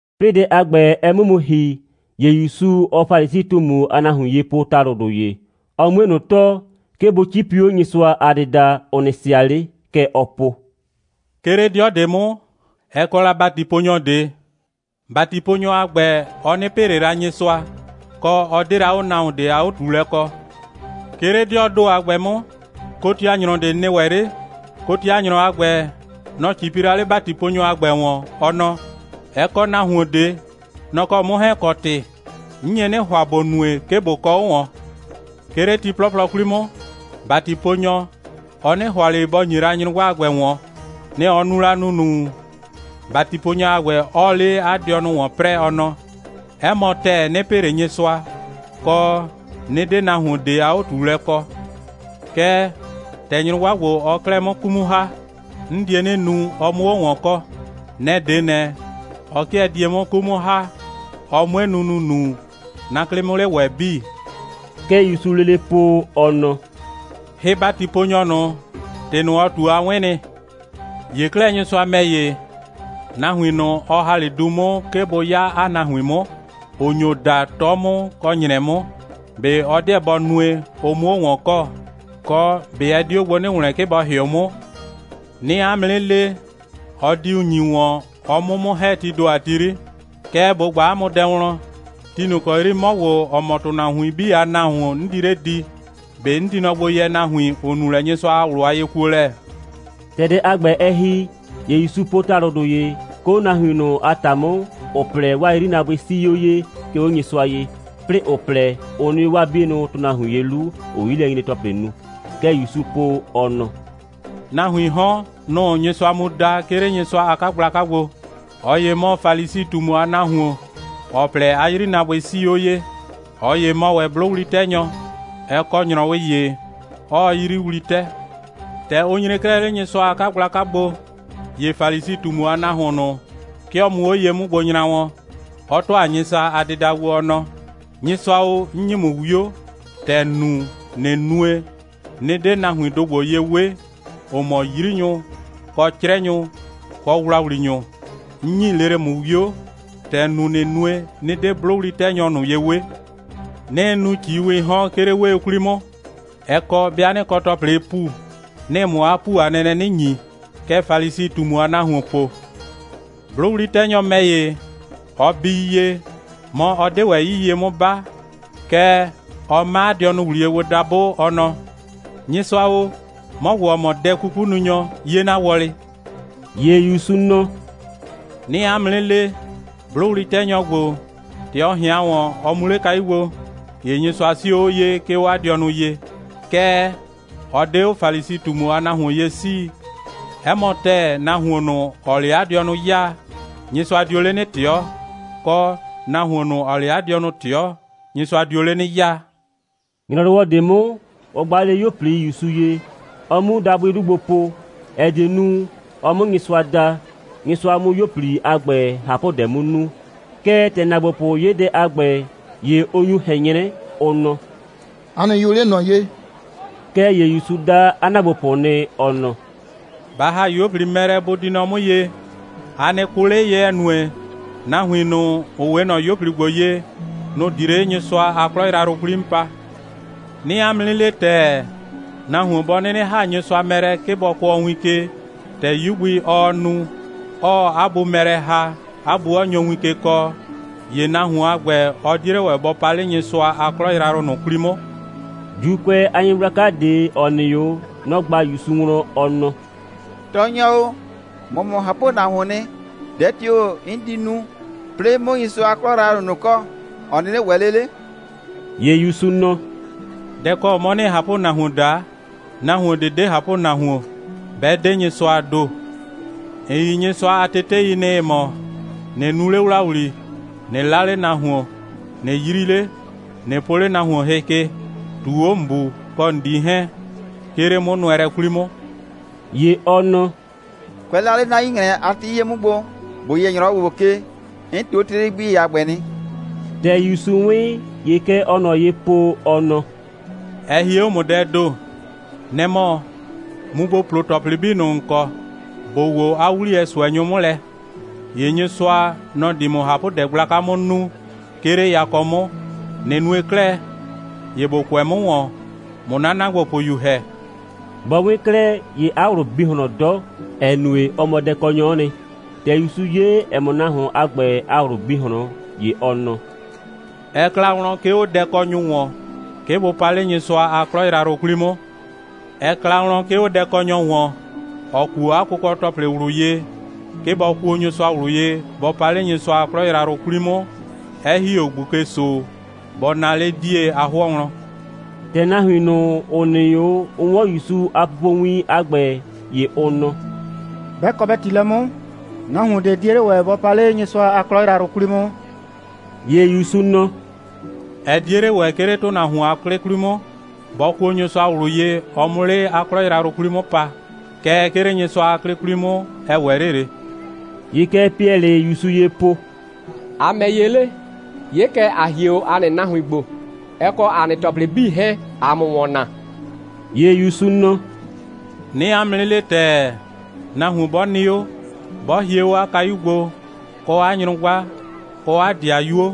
'Plɩɩ dɛ a ‑gbɛ, ɛ 'mʋ mu ‑hi, ‑ye ‑Yusu, ɔɔ Falisi꞊tumu a nahuin ye po ‑talʋdʋ ‑ye, ɔ 'mue ꞊nʋ tɔɔ, 'ke bʋ 'cipi 'o Nyɩsʋa a dɩda, ʋ nɩ sɩa 'le. Kɛ ɔɔ po: «'Ke 'le 'dɩɔ ꞊de 'mʋ, ɛ kɔ la ‑batiponyɔ ꞊de. ‑Batiponyɔ a ‑gbɛ, ɔ 'nɩ pɩ ꞊le la Nyɩsʋa, kɔ, ɔ 'de la 'o nahuon ꞊de a 'o꞊tuulɛ kɔ. 'Ke 'le 'dɩɔɔ ‑do a ‑gbɛ 'mʋ, kotianyrɔ ꞊de nɩ ‑wɛ 'le. Kotianyrɔ a ‑gbɛ, nɔ‑ 'cipi la 'le ‑batiponyɔ a ‑gbɛ ‑wɔn, ɔ nɔ: Ɛ kɔ nahuon ꞊de. Nɔ‑ kɔ 'mʋ 'hɛɛn‑ kɔ ‑tɩ. 'N nye 'nɩ ‑hʋa, ‑bo nue, 'ke ꞊bo kɔ 'o ꞊wɔn. 'Ke 'le ti 'plɔplɔ 'kwli 'mʋ, ‑batiponyɔ, ɔ 'nɩ ‑hʋa ꞊le bɔ ‑nye la nyrʋgba a ‑gbɛ ꞊wɔn. Nɛ‑ ɔ nu la ‑nunu, ‑batiponyɔ a ‑gbɛ 'ɔɔ 'le 'a dɩɔnʋ ‑wɔn 'prɛɛ, ɔ nɔ: 'Ɛ mɔ ‑tɛɛ, 'nɩ pɩ ꞊le Nyɩsʋa, kɔ, 'nɩ 'de nahuon ꞊de a 'o꞊tuulɛ kɔ. Kɛɛ, ‑tɛ nyrʋgba ‑gbo, ɔɔ 'klɛɛ 'mʋ 'ku 'mʋ ‑ha, 'n die 'nɩ nu, ɔ 'mʋ 'o ꞊wɔn kɔ. Nɛ‑ 'de ꞊nɛ, ɔ 'kɩɛ die 'mʋ 'ku 'mʋ ‑ha, ɔ 'mue nu ‑nunu, 'na 'klɩ 'mʋ 'le ‑wɛ 'bii.» Kɛ ‑Yusuu lele po, ɔ nɔ: «Hɩ‑batiponyɔ ꞊nʋ, ‑tɩ ꞊nʋ, ɔ ꞊tu, a 'wɩn nɩ. ‑Ye 'klɛɛ, Nyɩsʋa ‑mɛ ‑ye, nahuin ꞊nʋ, ɔ ‑ha 'le du 'mʋ, 'ke ‑bʋ 'ya 'a nahuin 'mʋ, ‑ʋ nyo da, 'tɔ 'mʋ kɔ ‑nyrɛ 'mʋ, ꞊be ɔ 'deɛ bɔ nue, ʋ 'mʋ 'o ꞊wɔn kɔ, kɔ, ꞊be ɛ di 'o gbo 'nɩ ‑wlɛn, 'ke bɔ ‑hɩʋ 'mʋ? 'Nɩɩ 'a mʋ 'nɩ le, ɔ diu ‑nyi ꞊wɔn, ɔ 'mu 'mʋ ‑hɛ, tii ‑do a ti 'yri. Kɛɛ, ꞊bo ꞊gba 'a mʋ wlɔn: ti ꞊nʋ ‑kɔ 'yri 'mɔ ‑gbo, ‑ɔ mɔ ‑tʋnahuin 'bii a Nahuon, 'n di 'le di, ꞊be 'n di nɔ gbo yɛ nahuin, ‑ʋ nu lɛ Nyɩsʋa a ꞊wlʋ a yekuolɛ?» ‑Tɛ dɛ a ‑gbɛ, ɛ ‑hi, ‑ye ‑Yusu po ‑talʋdʋ ‑ye, 'ke 'o nahuin ꞊nʋ a ‑ta 'mʋ, ‑ʋ plɛ, 'waa 'yrinaabʋɩ 'sii 'o ye, 'ke 'o Nyɩsʋa ye, 'plɩɩ ‑ʋ plɛ, ʋ nɩ 'o 'waa 'bienʋ ‑tʋnahuin ye 'lu, ‑ʋʋ 'yilɛnyre‑tɔplɩ nu. Kɛ ‑Yusuu po, ɔ nɔ: «Nahuiin 'hɔn, nʋ‑ʋ Nyɩsʋa mu da, 'ke 'le Nyɩsʋa a 'kagblaka gbo. ꞊Ɔ ‑ye mɔ Falisi꞊tumu a nahuon, (‑ɔ plɛ, 'a 'yrinaabʋɩ 'sii 'o ye.) ꞊Ɔ ‑ye mɔ ‑wɛ 'blʋwli'tɛnyɔ. (Ɛ kɔ ‑nyrɔwɩ ‑ye, 'ɔɔ 'yiyriwli 'tɛ.) ‑Tɛ ʋ nyre 'klɛɛ 'le Nyɩsʋa a 'kagblaka gbo, ‑ye Falisi꞊tumu a nahuon ꞊nʋ, 'ke ɔ mu 'o ye 'mʋ gbo nyra wɔn, 'ɔ ‑tʋa Nyɩsʋa a dɩda gbo, ɔ nɔ: Nyɩsʋa o, 'n ‑nyi ‑mʋ 'wio, ‑tɛ ‑n nu, ꞊nɩ nue, 'nɩ 'de nahuindʋ ‑gbo ye 'we, ‑ʋ mɔ 'yrinyʋ, kɔ 'crɛnyʋ, kɔ ‑wlawlinyʋ. 'N ‑nyi lele ‑mʋ 'wio, ‑tɛ ‑n nu, ꞊nɩ nue, 'nɩ 'de 'blʋwli'tɛnyɔ ꞊nʋ ye 'we. 'Nɩɩ nu ꞊ciiwɩɩ 'hɔn, 'ke 'le 'wee 'kwli 'mʋ, ɛ kɔ, 'bɩa 'nɩ kɔ ‑tɔplɩɩ ‑pu, 'nɩɩ ‑mʋ 'a ‑pu a nɛnɛ 'nɩ ‑nyi. Kɛ Falisi꞊tumu a nahuon po. 'Blʋwli'tɛnyɔ ‑mɛ ‑ye, ɔ bii ye, mɔ, ɔ 'de ‑wɛ 'yii ye 'mʋ 'ba, kɛɛ, ɔ 'ma 'a dɩɔnʋ ‑wliye gbo dabʋ, ɔ nɔ: Nyɩsʋa o, 'mɔ ‑gbo, ‑ɔ mɔ dɛ'kukununyɔ, 'ye 'na wɔlɩ.» ‑Ye ‑Yusu nɔ: «'Nɩɩ 'a mʋ 'nɩ le, 'blʋwli'tɛnyɔ ‑gbo, ‑tɛ ɔ ꞊hɩan ‑wɔn, ɔ mu 'le kayu gbo, ‑ye Nyɩsʋa 'sio 'o ye, 'ke 'o 'a dɩɔnʋ ye. Kɛɛ, ɔ 'de 'o Falisi꞊tumu a nahuon ye 'sii. 'Ɛ mɔ ‑tɛɛ, nahuon ꞊nʋ, ‑ɔɔ 'le 'a dɩɔnʋ 'yaa, Nyɩsʋa dio 'le 'nɩ ꞊tɩɔ, kɔ, nahuon ꞊nʋ, ‑ɔɔ 'le 'a dɩɔnʋ ꞊tɩɔ, Nyɩsʋa dio 'le 'nɩ 'yaa.» ‑Nyrɔwɔ ꞊de 'mʋ, 'ʋ gba 'le 'yuo꞊pli ‑Yusu ye, ɔ 'mu dabʋɩ 'lu gbo po, ‑ɛ die nu, ɔ 'mʋ Nyɩsʋa da, Nyɩsʋa 'mʋ 'yuo꞊pli a ‑gbɛ ꞊hapʋdɛ 'mʋ nu. Kɛɛ, ‑tɛ ‑naagbopʋ 'ye dɛ a ‑gbɛ, ‑ye ʋ nyu ꞊hɛn 'nyrɛ, ʋ nɔ: «A nɩ yʋ 'le ꞊nɔ ye!» Kɛɛ ‑ye ‑Yusu da 'a ‑naagbopʋ nɩ, ɔ nɔ: «Ba ‑ha 'yuo꞊pli mɛ lɛ, bʋ di nɔ 'mʋ ye. A nɩ kʋ 'le ye, ‑ɛ nue, nahuin ꞊nʋ, ‑ʋ 'we ꞊nɔ 'yuo꞊pli ‑gbo ye, nʋ‑ di 'le Nyɩsʋa a 'klɔ yrayrʋ 'kwli 'mʋ pa. 'Nɩɩ 'a mʋ 'nɩ le ‑tɛɛ, nahuon 'bɔ 'nɩnɩ ‑ha Nyɩsʋa mɛ lɛ, 'ke bɔ kʋɔ win ke, ‑tɛ 'yu gbi, ɔɔ nu, 'ɔɔ 'a bu mɛ lɛ ‑ha, 'a bu 'ɔ nyo win ke kɔɔ, ‑ye nahuon a ‑gbɛ, ɔ 'die 'le ‑wɛ bɔ pa 'le Nyɩsʋa a 'klɔ yrayrʋ ꞊nʋ 'kwli 'mʋ.» ‑Juukʋɛ a nyɩgblaka ꞊de, ‑ɔ nɩ 'o, nɔ‑ ꞊gba ‑Yusu wlɔn, ɔ nɔ: «Tɔɔnyɔ o, ‑mɔ mɔ ꞊hapʋnahuon. Dɛ tio‑ 'n di nu, 'plɩɩ 'mʋ Nyɩsʋa a 'klɔ yrayrʋ ꞊nʋ kɔ, ‑ɔ 'nɩnɩ ‑wɛ 'le 'le?» ‑Ye ‑Yusu nɔ: «Dɛ‑ kɔ 'mɔ ‑nɩɩ ꞊hapʋnahuon daa? Nahuon ꞊de 'de ꞊hapʋnahuon, 'bɛ 'de Nyɩsʋaa ‑do. ‑N yi Nyɩsʋa a tetei nɩ, ‑ɩ mɔ: ꞊Nɩ nu 'le ‑wlawli, ꞊nɩ 'la 'le nahuon, ꞊nɩ 'yri 'le, ꞊nɩ po 'le nahuon hɩ ke, ꞊tuu 'o ‑n bu kɔ ‑n 'dii 'hɛɛn, 'ke 'le 'mʋnʋɛlɛ 'kwli 'mʋ.» ‑Ye ɔ nɔ: «Kʋɛ la 'le 'na 'yu‑nyrɛ a ti 'yie 'mʋ gbo, ‑bo yɛ ‑nyrɔwɔ ‑gbo ke, 'n ꞊tuu 'o tetei 'bii a ‑gbɛ nɩ.» ‑Tɛ ‑Yusu 'wɩn, ‑ye kɛ ɔɔ ꞊nɔ ye po, ɔ nɔ: «Ɛ hie 'o ‑mʋ dɛɛ ‑do. Nɛ‑ mɔ, mu ‑bo plo ‑tɔplɩ 'bii ꞊nʋ, ‑n kɔ, ‑bo woo 'a 'wliyɛ ꞊sʋɛnyʋ 'mʋ lɛ, ‑ye Nyɩsʋa, nɔ‑ di ‑mʋ ꞊hapʋdɛ gblaka 'mʋ nu, 'ke 'le yakɔ 'mʋ. ꞊Nɩ nue 'klɛɛ, ‑ye ‑bo kʋɛ 'mʋ ‑wɔn, ꞊mʋ 'na ‑naagbopʋyu ‑hɛ.» Bɔ 'wɩn 'klɛɛ, ‑ye 'a ꞊wlʋ bi ꞊hlɔn 'dɔ, ‑ɛ nue, ɔ mɔ dɛkɔnyɔ'ɔ nɩ. ‑Tɛ ‑Yusu 'ye, ‑ɛ mɔ, nahuon a ‑gbɛ a ꞊wlʋ bi ꞊hlɔn, ‑ye ɔ nɔ: «Ɛ kla wlɔn, 'ke 'o dɛkɔnyʋ ‑wɔn, 'ke bʋ pa 'le Nyɩsʋa a 'klɔ yrayrʋ 'kwli 'mʋ. Ɛ kla wlɔn, 'ke 'o dɛkɔnyɔ ‑wɔn, ‑ɔ kuo 'a kʋkɔ‑tɔplɩ ꞊wlʋ ye, 'ke bɔ kuo Nyɩsʋa ꞊wlʋ ye, bɔ pa 'le Nyɩsʋa a 'klɔ yrayrʋ 'kwli 'mʋ, 'ɛ ‑hi 'o ꞊gbuke‑so bɔ naa 'le 'die a 'hʋɔ wlɔn.» ‑Tɛ nahuin ꞊nʋ, ‑ʋ nɩ 'o, ʋ 'wɔn ‑Yusu a pupowin a ‑gbɛ, ‑ye ʋ nɔ: «'Bɛ kɔ bɛ ‑ti lɛ 'mʋ, nahuon ꞊de 'die 'le ‑wɛ bɔ pa 'le Nyɩsʋa a 'klɔ yrayrʋ 'kwli 'mʋ.» ‑Ye ‑Yusu nɔ: «Ɛ 'die 'le ‑wɛ, 'ke 'le ‑tʋnahuon a 'klɩ 'kwli 'mʋ, bɔ kuo Nyɩsʋa ꞊wlʋ ye, ɔ 'mʋ 'le 'a 'klɔ yrayrʋ 'kwli 'mʋ pa. Kɛɛ, 'ke 'le Nyɩsʋa a 'klɩ 'kwli 'mʋ, ɛ ‑wɛ 'le ꞊le.» ‑Ye kɛ Piɛlɩɩ ‑Yusu ye po: «‑A ‑mɛ ‑ye 'le? 'Ye kɛ, ‑a hie 'o ‑a nɩ nahuin gbo, ɛ kɔ ‑a nɩ ‑tɔplɩ 'bii 'hɛɛn, ꞊aa ‑mʋ ‑wɔn naa.» ‑Ye ‑Yusu nɔ: «'Nɩɩ 'a mʋ 'nɩ le ‑tɛɛ, nahuon 'bɔ nɩ 'o, 'bɔ hie 'o 'a kayu gbo, kɔ 'a nyrʋgba, kɔ 'a ‑dɩayuo,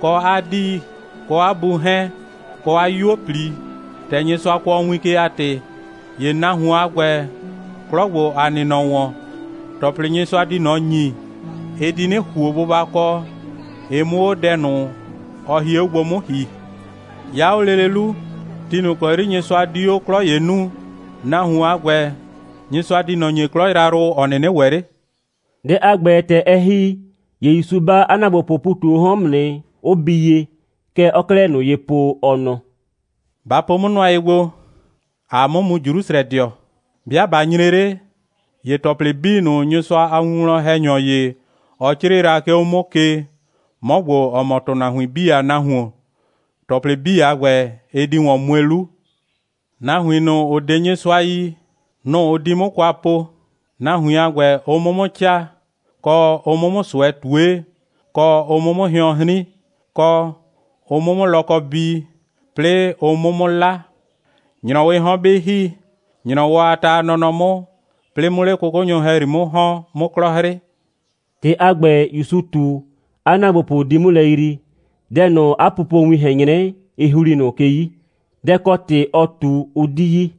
kɔ 'a dii kɔ 'a bu 'hɛɛn, kɔ 'a 'yuo꞊pli, ‑tɛ Nyɩsʋa kʋɔ win ke a ‑tɩ, ‑ye nahuon a ‑gbɛ, 'klɔ ‑gbo, ‑a nɩ nɔ ‑wɔn, ‑tɔplɩ, Nyɩsʋa di ꞊nɔ ‑nyi, ɩ di 'nɩ ‑huo bʋbakɔ, ɩ 'mʋ 'o dɛ ꞊nʋ, ɔ hie 'o gbo 'mʋ ‑hi. 'Ya 'o lele 'lu, ti ꞊nʋ ‑kɔ 'yri Nyɩsʋa di 'o 'klɔ ‑ye nuu, nahuon a ‑gbɛ, Nyɩsʋa di ꞊nɔ ‑nyi 'klɔ yrayrʋ, ‑ɔ 'nɩnɩ ‑wɛ 'le.» Dɛ a ‑gbɛ, ‑tɛ ɛ ‑hi, ‑ye ‑Yusu 'ba 'a ‑naagbopʋʋ ‑pu ꞊tu 'o 'hɔn 'mʋ nɩ, 'ʋ bii ye. Kɛ ɔɔ 'klɛɛ ꞊nʋ ye po, ɔ nɔ: «Ba po 'mʋ nʋa ye gbo. ‑Aa 'mʋ mu Jrusrɛdɩɔ. 'Bɩa ꞊ba nyre 'le, ‑ye ‑tɔplɩ 'bii ꞊nʋ, Nyɩsʋa a winwlɔn‑hɛnyɔ ‑ye, ɔ 'crɩɩ la, 'ke 'o 'mʋ ke, 'mɔ ‑gbo, ‑ɔ mɔ ‑tʋnahuin 'bii a Nahuon, ‑tɔplɩ 'bii a ‑gbɛ, ɩ di ‑wɔn mue 'lu. Nahuin ꞊nʋ, ‑ʋ 'de Nyɩsʋa yi, nʋ‑ ʋ di 'mʋ kwa po, nahuin a ‑gbɛ, ʋ 'mʋ 'mʋ 'caa, kɔ, ʋ 'mʋ 'mʋ ꞊sʋɛ ꞊tue, kɔ, ʋ 'mʋ 'mʋ hɩɔn 'hrin, kɔ, ʋ 'mʋ 'mʋ lɔkɔ bii, 'plɩɩ ʋ 'mʋ 'mʋ 'la. ‑Nyrɔwɩɩ 'hɔn 'bɩ ‑hi, ‑nyrɔwɔ a ta a nɔnɔ 'mʋ, 'plɩɩ 'mʋ 'le 'kʋkʋnyʋ ‑hɛyri 'mʋ ‑hɔn, 'mʋ 'klɔ 'hrɩ.» ‑Tɩ a ‑gbɛ, ‑Yusu ꞊tu, 'a ‑naagbopʋ 'di 'mʋ lɛ yrii. Dɛ ꞊nʋ, 'a pupowin ꞊hɛn 'nyrɛ, ɩ ‑hli ꞊nʋ ke 'yi. Dɛ ‑kɔ ‑tɩ ɔ ꞊tu, ʋ 'di yi.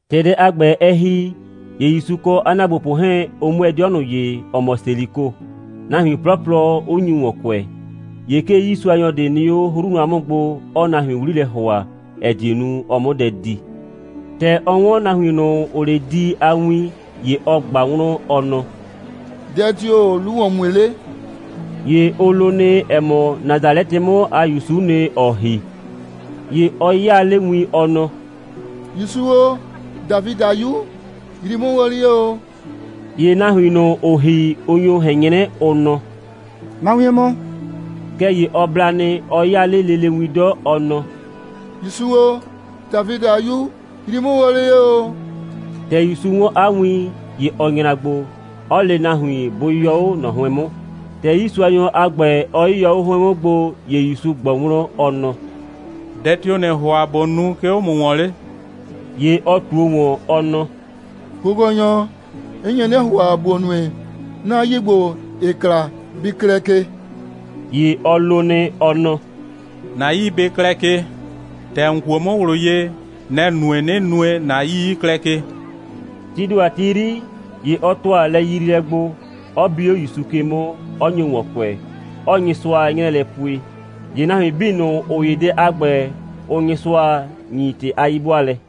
‑Tɛ dɛ a ‑gbɛ ɛ ‑hi, ‑ye ‑Yusu kɔ 'a ‑naagbopʋ 'hɛɛn, ʋ 'mʋɛɛ 'dɩɔ ꞊nʋ ye, ‑ɔ mɔ Seliko, nahuin 'plɔplɔ 'ʋ nyu ‑wɔn kʋɛ. ‑Ye 'ke 'yiisuanyɔ ꞊de nɩ 'o 'hru nʋa 'mʋ gbo, 'ɔɔ nahuin 'wli lɛ ‑hʋa, ‑ɛ die nu, ɔ 'mʋ dɛ di. ‑Tɛ ɔ 'wɔn nahuin ꞊nʋ, ‑ʋʋ 'le di a win, ‑ye ɔ ꞊gba wlɔn, ɔ nɔ: «Dɛ tio‑o 'lu ‑wɔn mue 'le?» ‑Ye ʋ lo nɩ, ‑ɛ mɔ, Nasalɛtɩ 'mʋ a ‑Yusu'u nɩ, ‑ɔɔ ‑hi. ‑Ye ɔ 'yaa 'le win, ɔ nɔ: «‑Yusu o, Dafidɩ a 'Yu, yrii 'mʋ wɔlɩ ye ‑o!» ‑Ye nahuin ꞊nʋ, ‑ʋʋ ‑hi, ʋ nyo ꞊hɛn 'nyrɛ, ʋ nɔ: «Ma wien mɔ!» Kɛɛ ‑ye ɔ bla nɩ, 'ɔ 'yaa 'le lele win 'dɔ, ɔ nɔ: «‑Yusu o, Dafidɩ a 'Yu, yrii 'mʋ wɔlɩ ye ‑o!» ‑Tɛ ‑Yusu 'wɔn 'a win, ‑ye ɔ nyra gbo, 'ɔ le nahuin, bʋ yɔ 'o ꞊nɔ 'hʋɩn 'mʋ. ‑Tɛ 'yiisuanyɔ a ‑gbɛ, ɔ 'yɩyɔ 'o 'hʋɩn 'mʋ gbo, ‑ye ‑Yusu ꞊gbɔ wlɔn, ɔ nɔ: «Dɛ tio‑ ‑nɩɩ ‑hʋa, ꞊bo nu, 'ke 'o ‑mʋ ‑wɔn 'le?» ‑Ye ɔ ꞊tuo ‑wɔn, ɔ nɔ: «Kʋkɔnyɔ o, 'n nye 'nɩ ‑hʋa, ‑bo nue, 'na 'yii ‑gbo, ‑ɩɩ kla, bɩ klɛ ke!» ‑Ye ɔ lo nɩ, ɔ nɔ: «‑Na 'yii bɩ klɛ ke. ‑Tɛ ‑n kuo 'mʋ ꞊wlʋ ye, nɛ‑ nue, 'nɩ nue, ‑na 'yii 'ɩ klɛ ke.» Tii ‑do a ti 'yri, ‑ye ɔ ‑tʋa lɛyriilɛ gbo, 'ɔ bi 'o ‑Yusu ke 'mʋ, 'ɔ nyo ‑wɔn kʋɛ, 'ɔɔ Nyɩsʋa 'nyrɛɛ lɛ pue. ‑Ye nahuin 'bii ꞊nʋ, ‑ʋ 'ye dɛ a ‑gbɛ, ʋʋ Nyɩsʋa ‑nyi ‑tɩ a 'yi'bʋaalɛ.